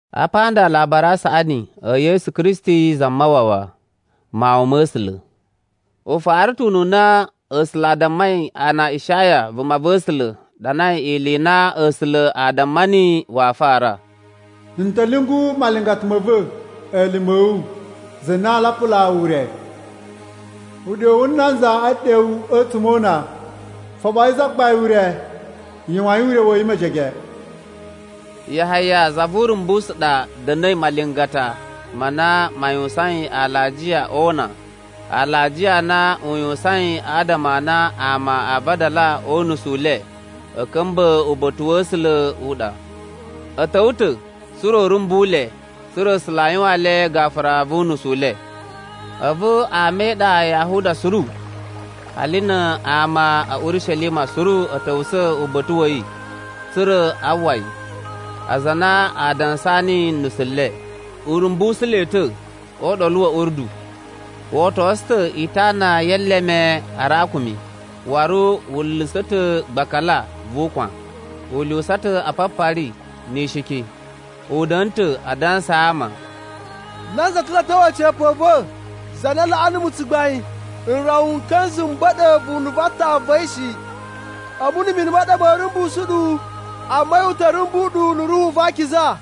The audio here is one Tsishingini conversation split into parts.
Apa nda Alabari a Saꞌani e Yesu Kristi Zamawawa, Mawun ma̱ A̱sula̱. U fara ta̱ ununa A̱sula̱ a dammai ana Ishaya vumava̱sula̱ ɗanai ili i na A̱sula̱ a damma niyi waa fara: “N ta̱ lyungu malingata ma̱ va̱, elime a̱ wu, za na aa lapulaa wu ure. Uɗyo wu nanza e ɗewu a̱tsuma̱ o una, ‘Foɓoyi Zagbain ure, yuwain ure wa̱ yi mejege.’” Yahaya za vu Urumbusu ɗa da̱na̱i malingata ma na ma yuwusain alajiya o una. Alajiya a na u yuwusain adama a na ama aa vadala o unusu u le a̱ ka̱mba̱ uba̱ta̱ wa̱ A̱sula̱ u ɗa. A̱ ta̱wa̱ ta̱ tsa̱ra̱ u rumbu le tsa̱ra̱ A̱sula̱ a yuwaan le gafura vu nusu le. A̱vu ama e iɗa ya Yahuda suru, hali na ama a̱ Urishelima suru a̱ ta̱wusa̱ uba̱ta̱ wa̱ yi tsa̱ra̱ a uwwa yi. Aza a na a dansaa niyi nusu le, u rumbusu le ta̱ o Uɗolu wa̱ Urdu. Wo otosu ta̱ itana ye eleme a arakumi, waru wu nla̱sa̱ ta̱ gbakala vu ukwan. U lyuwusa ta̱ apapari ni ishiki. U da̱na̱ ta̱ a dansaa ama, “Nanza ta̱ lo a̱ ta̱wa̱ a̱ca̱pa̱ a̱ va̱ za na laꞌa numu tsugbain, n rawa n ka̱nza̱ m ba̱ɗa̱ vunu va aatan va̱ yi shi. A̱mu na̱ mini ma ɗa ma̱a̱ rumbusu ɗu, amma a̱yi u ta̱ rumbu ɗu na̱ Ruhu va Akiza.”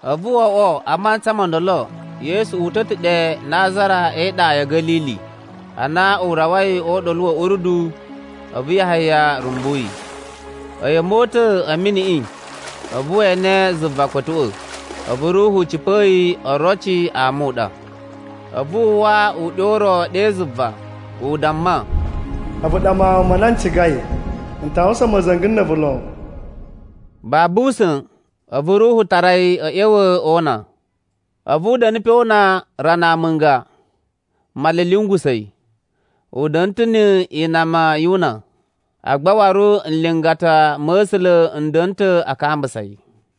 A̱vu wo oꞌwo a mantsa mo ndolo Yesu uta̱ ta̱ ɗe Nazara e iɗa ya̱ Ga̱lili. Ana u rawai o Uɗolu wa̱ Urdu, a̱vu Yahaya rumbu yi. A̱yi a̱ mota̱a̱ a̱ miniꞌi, a̱vu we ene zuva kpa̱tuꞌwa̱, a̱vu Ruhu cipa̱a̱ yi oroci a muɗa. A̱vu a uwwa uɗyo u ro ɗe zuva, u damma, “A̱vu ɗa Mawun ma na n cigai, n ta yuwusan ma̱za̱nga̱ na̱ a̱vu lon.” Babu usa̱n, a̱vu Ruhu tara yi a̱ ꞌya̱wa̱ o una. A̱vu u da̱na̱ pe o una rana amunga, Male a̱ lyungusa̱ yi. U da̱nu ta̱ ni inama yu una, agba waru nlingata ma̱ A̱sula̱ n da̱na̱ ta̱ a kambusa yi.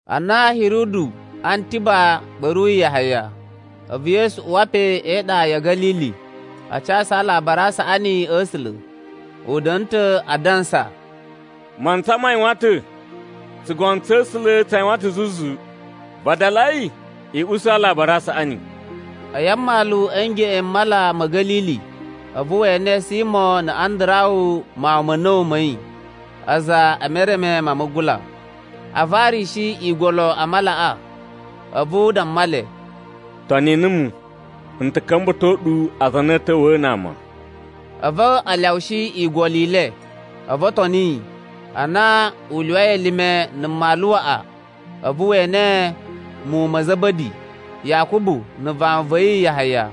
Ana Hiridu Antiba ɓa̱ruyi Yahaya, a̱vu Yesu uwa pe e iɗa ya̱ Ga̱lili a casu Alabari a Saꞌani a̱ A̱sula̱. U da̱na̱ ta̱ a dansa, “Mantsa ma yuwan ta̱, tsugono tsa̱ A̱sula̱ tsa yuwan ta̱ zuzu. Vadalai, i usu Alabari a Saꞌani.” A̱yi a mmalu a̱ ngeꞌen m Mala ma̱ Ga̱lili, a̱vu we ene Simo na̱ Andarawu mawun ma̱ a̱na̱wu ma̱ yi a̱za̱ e mereme ma mugula, a varishi igolo a malaꞌa. A̱vu u damma le, “Toni numu, n ta̱ ka̱mba̱to ɗu aza a na a̱ ta̱wa̱a̱ na ama.” A̱vu a lyawushi igolo i le, a̱vu o toni yi. Ana u lyuwai elime na̱ mmalu waꞌa, a̱vu we ene muwun ma̱ Za̱ba̱di, Yakubu na̱ vawun va̱ yi Yahaya,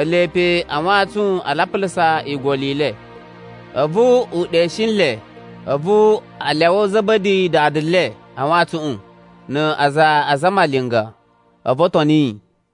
ele pe a wantsun a lapulusa igolo i le. A̱vu u ɗeshi nle, a̱vu a lyawa Za̱ba̱di dada le a wantsuꞌun na aza a zamalinga. A̱vu o toni yi.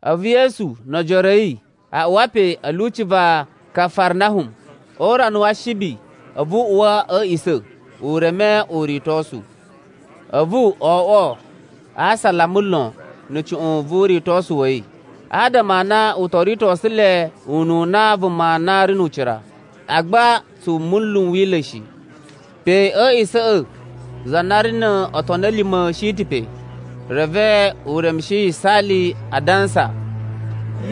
A̱vu Yesu no ojoro a̱ yi a uwa pe a̱ lyuci va Kafarnahum. O urana wa Ashibi a̱vu u uwa a̱ a̱a̱ꞌisa̱, u reme uritosu. A̱vu o oꞌwo asalama lon na̱ cuꞌun vu uritosu wa̱ yi, adama a na u to ritosu le ununa vuma na ri nu ucira, agba tsu munlu n Wila̱ shi. Pe a̱ a̱a̱ꞌisa̱ꞌa̱ za na ri no otoni a̱ lima̱ shi ta̱ pe reve u remushi yisaali, a dansa,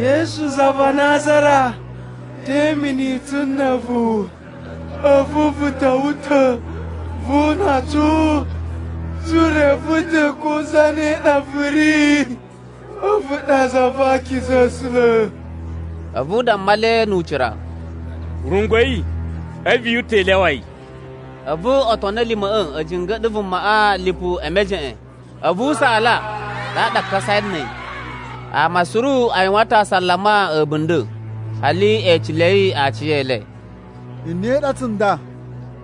“Yesu za va Nazara, te imini tsu na̱ a̱vu? A̱vu vu ta̱wa̱ ta̱ vu una tsu? Tsu reve ta̱ ko zane ɗa vu ri, a̱vu ɗa za va akiza a̱ A̱sula̱.” A̱vu u damma le nu ucira, “Rungwa̱i, a̱vu yu uta̱ i lyawa yi!” A̱vu otoni a̱ lima̱ꞌa̱ a̱ jinga̱ɗa̱ vumaꞌa lipu e mejeꞌen, a̱vu u saala, ɗaɗa a kasai na̱ a̱yi. Ama suru a yuwan ta̱ asalama a̱bunda̱, hali e ecelei aciyele, “Nye ɗa tsunda?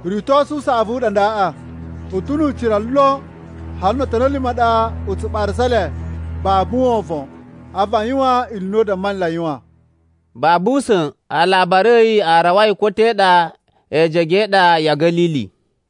Uritosu u saꞌavu u ɗa ndaꞌa. U ta̱ nu ucira lon. Hali no otoni a̱ lima̱ a ɗa u tsu ɓarasa le babu wovon, a̱vu a yuwan ili i na u damma nle a yuwan.” Babu usa̱n alabari a̱ yi a rawai ko te ɗa ejege e iɗa ya̱ Ga̱lili.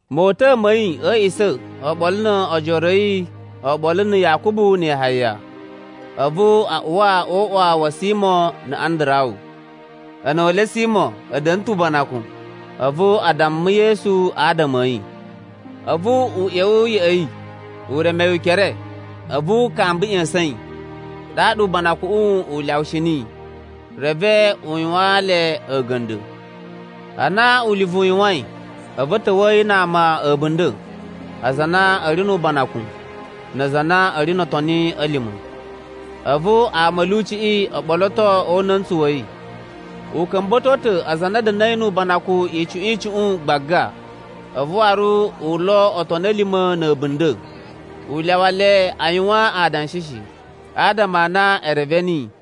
Mota̱a̱ ma̱ yi a̱ a̱a̱ꞌisa̱ oɓolo no ojoro a̱ yi oɓolo na̱ Yakubu na̱ Yahaya, a̱vu a uwa o uꞌwa wa̱ Simo na̱ Andarawu. A̱na̱wa̱le Simo a̱ da̱na̱ ta̱ ubanakun, a̱vu a damma Yesu adama a̱ yi. A̱vu u ꞌya̱wa̱ ya̱ꞌa̱ yi, u reme yi ukere, a̱vu u kamba ꞌya̱sa̱n yi, ɗaɗa ubanakuꞌun u lyawushi niyi. Reve u yuwaan le a̱ga̱nda̱. Ana ulivu u yuwain, a̱vu a̱ ta̱wa̱a̱ yi na ama a̱bunda̱, aza a na a̱ ri nu ubanakun, na aza a na a̱ ri no otoni a̱ lima̱. A̱vu ama a̱ lyuciꞌi o ɓoloto o una̱ntsu wa̱ yi. U ka̱mba̱to ta̱ aza a na a̱ da̱na̱i nu ubanakun icuꞌun icuꞌun gbaga, a̱vu waru u lo otoni a̱ lima̱ na̱ a̱bunda̱. U lyawa le a yuwan adanshi shi, adama a na e reve niyi.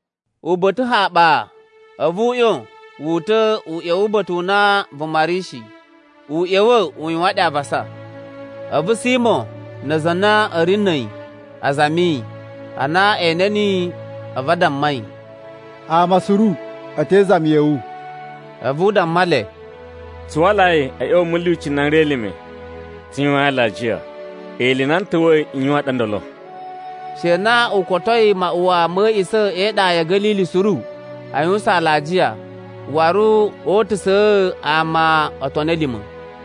Uba̱ta̱ haɓa, a̱vu u ꞌyon wu uta̱ u ꞌya̱wa̱ uba̱ta̱ u na vuma ri shi. U ꞌya̱wa̱ u yuwan ɗe avasa. A̱vu Simo na aza a na a̱ ri na̱ a̱yi a zami yi. Ana e ene niyi, a̱vu a damma yi, “Ama suru a̱ te izami ya̱ wu.” A̱vu u damma le, “Tsu walai a̱ ꞌya̱wa̱ a̱ mulyuci n na n ri elime, tsu yuwain alajiya. Ili i na n ta̱wa̱i n yuwan ɗa ndolo.” She na u kotoi maꞌuwa ma̱ a̱ꞌisa̱ e iɗa ya̱ Ga̱lili suru a yuwusan alajiya, waru o utusa̱a̱ ama otoni a̱ lima̱.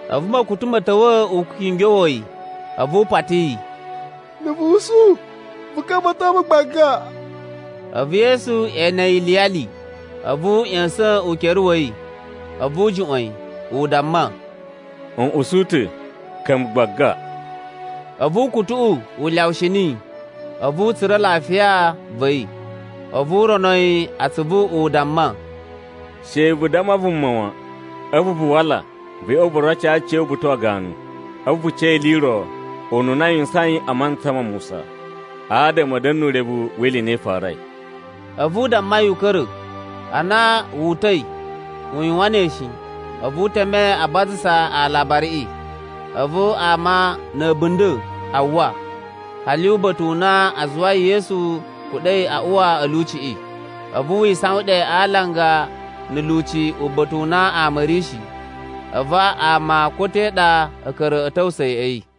A̱vu ma̱kutu ma̱ ta̱wa̱ u kingyowa̱ yi, a̱vu u pati yi, “Na̱ vu usu, vu ka̱mba̱to mu gbaga.” A̱vu Yesu ene yi iliyali, a̱vu u ꞌya̱sa̱n ukere wa̱ yi, a̱vu u juꞌwa̱n yi, u damma, “N usu ta̱, ka̱mba̱ gbaga.” A̱vu ukutuꞌu u lyawushi niyi, a̱vu u tsura̱ lafiya va̱ yi. A̱vu u rono yi atsuvu u damma, “She vu damma vuma wan. A̱vu vu wala vu ꞌya̱wa̱ vu roco aciya̱wu uba̱ta̱ wa ganu. A̱vu vu ca ili i ro, ununa a yuwusain a mantsa ma Musa, adama a̱ da̱na̱ nu urevu wi ili i na i farai.” A̱vu u damma yi u ka̱ra̱. Ana wu uta̱i, u yuwan ne shi, a̱vu u teme a bazasa alabariꞌi. A̱vu ama na̱ a̱bunda̱ a uwwa, hali uba̱ta̱ u na a zuwai Yesu kuɗa̱i a uwa a̱ lyuciꞌi. A̱vu wi isawan ɗe alanga na̱ lyuci uba̱ta̱ u na ama a̱ ri shi. A̱vu ama ko te ɗa a̱ ka̱ra̱ a̱ ta̱wusa̱ ya̱ꞌa̱ yi.